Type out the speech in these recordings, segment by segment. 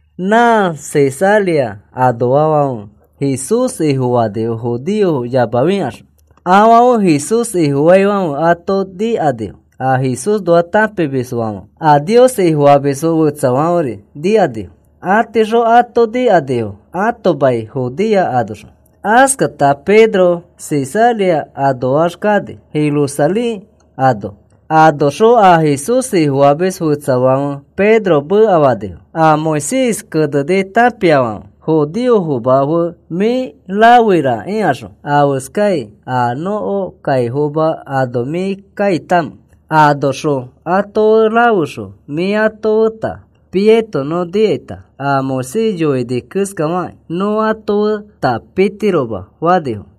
Nã Cesarea anoafãfe Jesús Ifofanifo judeofo yamafikaxõ. Afãfe Jesús Ifofaifãfe ato nikanifo a Jesúsxõ tãpimiskõifãfe. A Nios Ifofamisfo fetsafãferi nikanifo. Atiixõ ato nikanifo ãto mai Judea anoxõ. Askata Pedro Cesarea anoax kani Jerusalén ano. Anoxõ a Jesús Ifofamis fetsafãfe Pedro mekafanifo a Moisés keneni tãpiafãfe: “Judeofoma fe mĩ rafeira,” ikaxõ. Iskafanifo: “¿Afeskai a nõko kaifoma ano mĩ kaitamẽ? Anoxõ ato fe rafexõ mĩ ato feta piaito nõ nikaita a Moisés yoini keskafakĩ nõ ato feta pitiroma,” fanifo.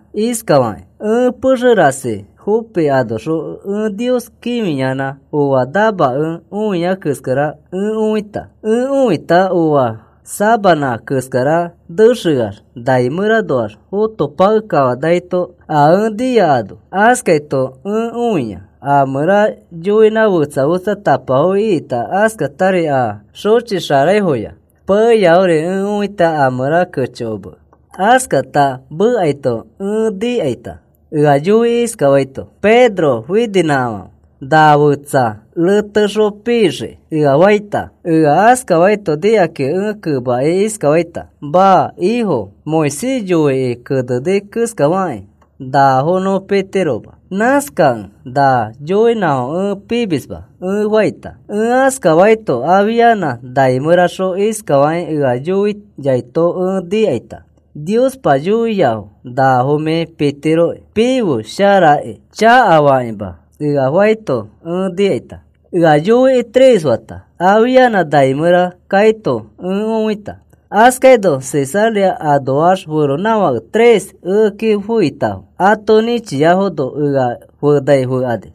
iskafakĩ: “Ẽ pexe rasi Jope anoxõ ẽ Nios kĩfiyanã oa namakẽ õia keskara ẽ õita. Ẽ õita oa sabanã keskara nexeax nai mẽranoax fotopakekafanaito a ẽ nia ano. Askaito ẽ õia a mẽra yoinã fetsa fetsatapafo ikita askatari a xõchixaraifoya peyafori ẽ õita a mẽra kechokomekẽ. Askata mekaito ẽ nikaita ea yoikĩ iskafaito: ‘Pedro, fininãkafãfe. Na fetsa retexõ pixiki,’ ea faita. Ea askafaito nikakĩ ẽ kemakĩ iskafaita: ‘Maa, Ifo. Moisés yoikĩ keneni keskafakĩ, nafo nõ pitiroma. Nãskakẽ na yoinãfo ẽ pimisma,’ ẽ faita. Ẽ askafaito afianã nai mẽraxõ iskafakĩ ea yoiaito ẽ nikaita: ‘Niospa yoia nafo mĩ pitiroki. Pife, sharaki, chakafakĩma,’ ea faito ẽ nikaita. Ea yoikĩ tres fata, afianã nai mẽra kaito ẽ õita. Askaino Cesarea anoax feronãfake tres ekeki feitafo. Ato nĩchiafono ea fenai fekani.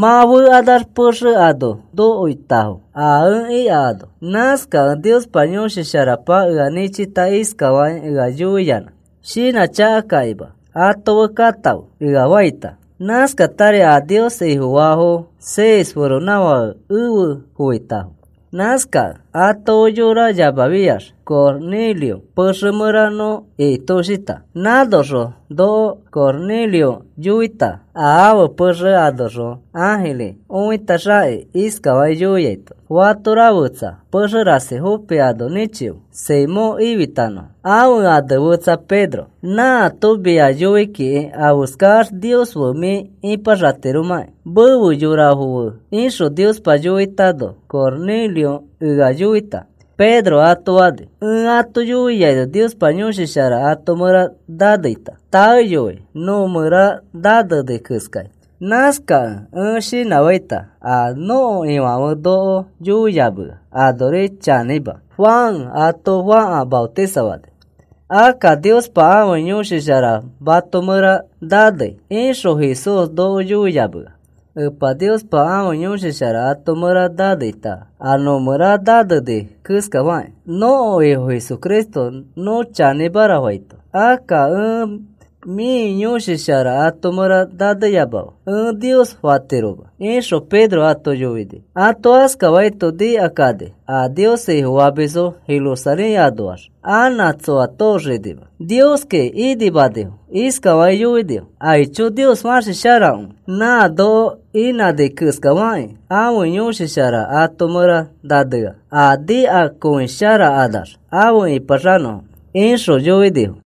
Mã fekanax pexe ano nokoitafo a ẽ ika ano. Nãskakẽ Niospa Yõshi Sharapa ea nĩchita iskafakĩ ea yoiyanã: ‘Shinãchakakĩma ato fe katãfe,’ ea faita. Nãskatari a Nios Ifofaafo seis feronãfake efe foitafo. Nãskakẽ ato fe yora yamafiax Cornelio pexe mẽra nõ ikitoshita. Nãnoxõ noko Cornelio yoita a ãfe pexe anoxõ ãjiri õitaxakĩ iskafakĩ yoiaito: ‘Fatora fetsa pexe rasi Jope ano nĩchife Simón ifitanõfo, ãfe ane fetsa Pedro. Nãato mia yoi kiki afeskax Nios fe mĩ ipaxatiromãkĩ, mefe yorafo fe,’ ixõ Niospa yoitano Cornelio ea yoita,” Pedro ato fani. “Ẽ ato yoiaino Niospa Yõshi Shara ato mẽra naneita, taeyoi nõ mẽra naneni keskai. Nãskakẽ ẽ shinãfaita a nõko Ifãfe noko yoiyamea anori chanĩma. ‘Juan ato fãka maotisafani, akka Niospa ãfe Yõshi Shara mato mẽra nanei,’ ixõ Jesús noko yoiyamea. Epa Niospa ãfe Yõshi Shara ato mẽra naneita a nõmẽra naneni keskafakĩ, nõko Ifo Jesucristo nõ chanĩmara faito. Akka ẽ, ‘Mĩ Yõshi Shara ato mẽra naneyamafe,’ ẽ Nios fatiroma,” ixõ Pedro ato yoini. Ato askafaito nikakani a Nios Ifofamisfo Jerusalén anoax anã tsoa tooxinima, Nioskiroko inimanifo. Iskafakĩ yoinifo: “Aicho, Nios fãsi sharakõi, nã noko inãni keskafakĩ, ãfe Yõshi Shara ato mẽra nanea, a nikakõisharakanax afe ĩpaxanõfo,” ixõ yoinifo.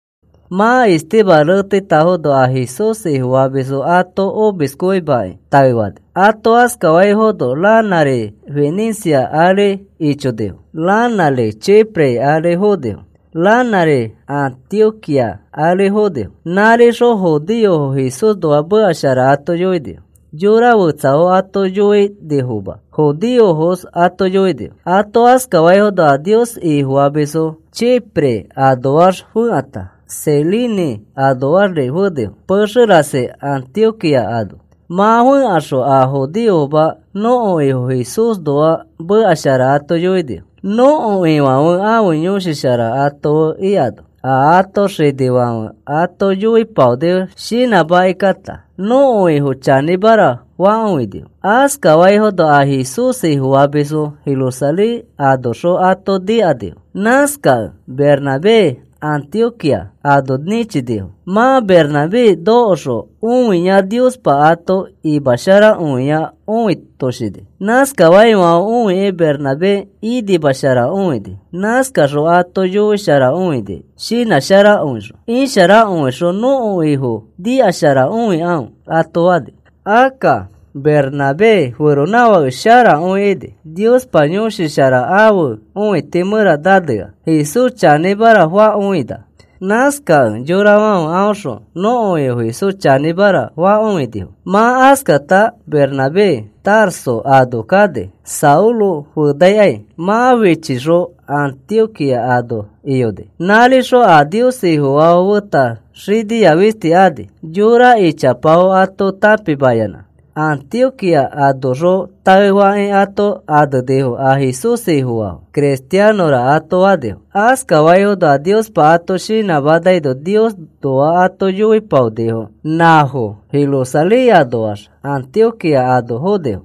Mã Esteban reteitafono a Jesús Ifofamisfo ato omiskõimakĩ taefanifo. Ato askafaifono ranãri Fenicia ari ichonifo, ranãri Chipre ari fonifo, ranãri Antioquía ari fonifo. Nãrixõ judeofo Jesúsnoa meka shara ato yoinifo. Yora fetsafo ato yoinifoma, judeofos ato yoinifo. Ato askafaifono a Nios Ifofamisfo Chipre anoax fekãta Cirene anoaxri fenifo pexe rasi Antioquía ano. Mã fẽkaxõ a judeofoma nõko Ifo Jesúsnoa meka shara ato yoinifo. Nõko Ifãfe ãfe Yõshi Shara ato fe ikano, a ãto xinifãfe ato yoipaonifo shinãmakikãta nõko Ifo chanĩmara fakõinifo. Askaifono a Jesús Ifofamisfãfe Jerusalén anoxõ ato nikanifo. Nãskakẽ Bernabé Antioquía ano nĩchinifo. Mã Bernabé nokoxõ õia Niospa ato imasharakõia õitoshini. Askaifãfe õikĩ Bernabé inimasharakõini. Nãskaxõ ato yoisharakõini shinãsharakõixõ. “Isharakõixõ nõko Ifo nikasharakõikãfe,” ato fani. Akka Bernabé feronãfake sharakõi ini. Niospa Yõshi Shara ãfe õiti mẽra nanea, Jesús chanĩmara fakõina. Nãskakẽ yorafãfe aõxõ nõko Ifo Jesús chanĩmara fakõinifo. Mã askata Bernabé Tarso ano kani Saulo fenaikai. Mã fichixõ Antioquía ano iyoni. Nãrixõ a Nios Ifofaafo feta xinia fisti ani, yora ichapafo ato tãpimayanã. Antioquía anoxõ taefakĩ ato anenifo a Jesús Ifofaafo. “Cristianõra,” ato fanifo. Askaifono a Niospa ato shinãmanaino Niosnoa ato yoipaonifo nãfo Jerusalén anoax Antioquía ano fonifo.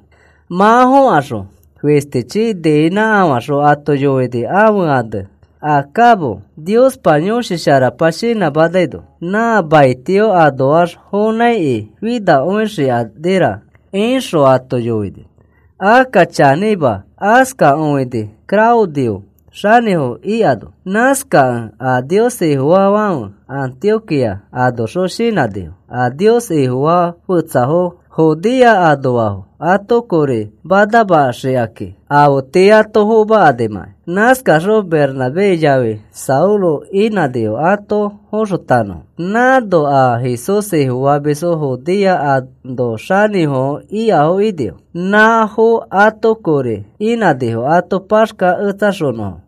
Mã fokaxõ fishtichi niinãkafãxõ ato yoini ãfe ane Agabo, Niospa Yõshi Sharapa shinãmanaino, “Nã maitio anoax fonãiki finakõixikanira,” ixõ ato yoini. Akka chanĩma, askakõini Claudio xanĩfo ikano. Nãskakẽ a Nios Ifofaafãfe Antioquía anoxõ shinãnifo a Nios Ifofaa fetsafo Judea anoafo ato kori manamaxikakĩ, afe tii ato fomakanimãkai. Nãskakaxõ Bernabé yafi Saulo inãnifo ato foxotanõfo. Nãno a Jesús Ifofamisfo Judea ano xanĩfofo ikafo inifo. Nãfo ato kori inãnifo ato paxkaketsaxonõfo.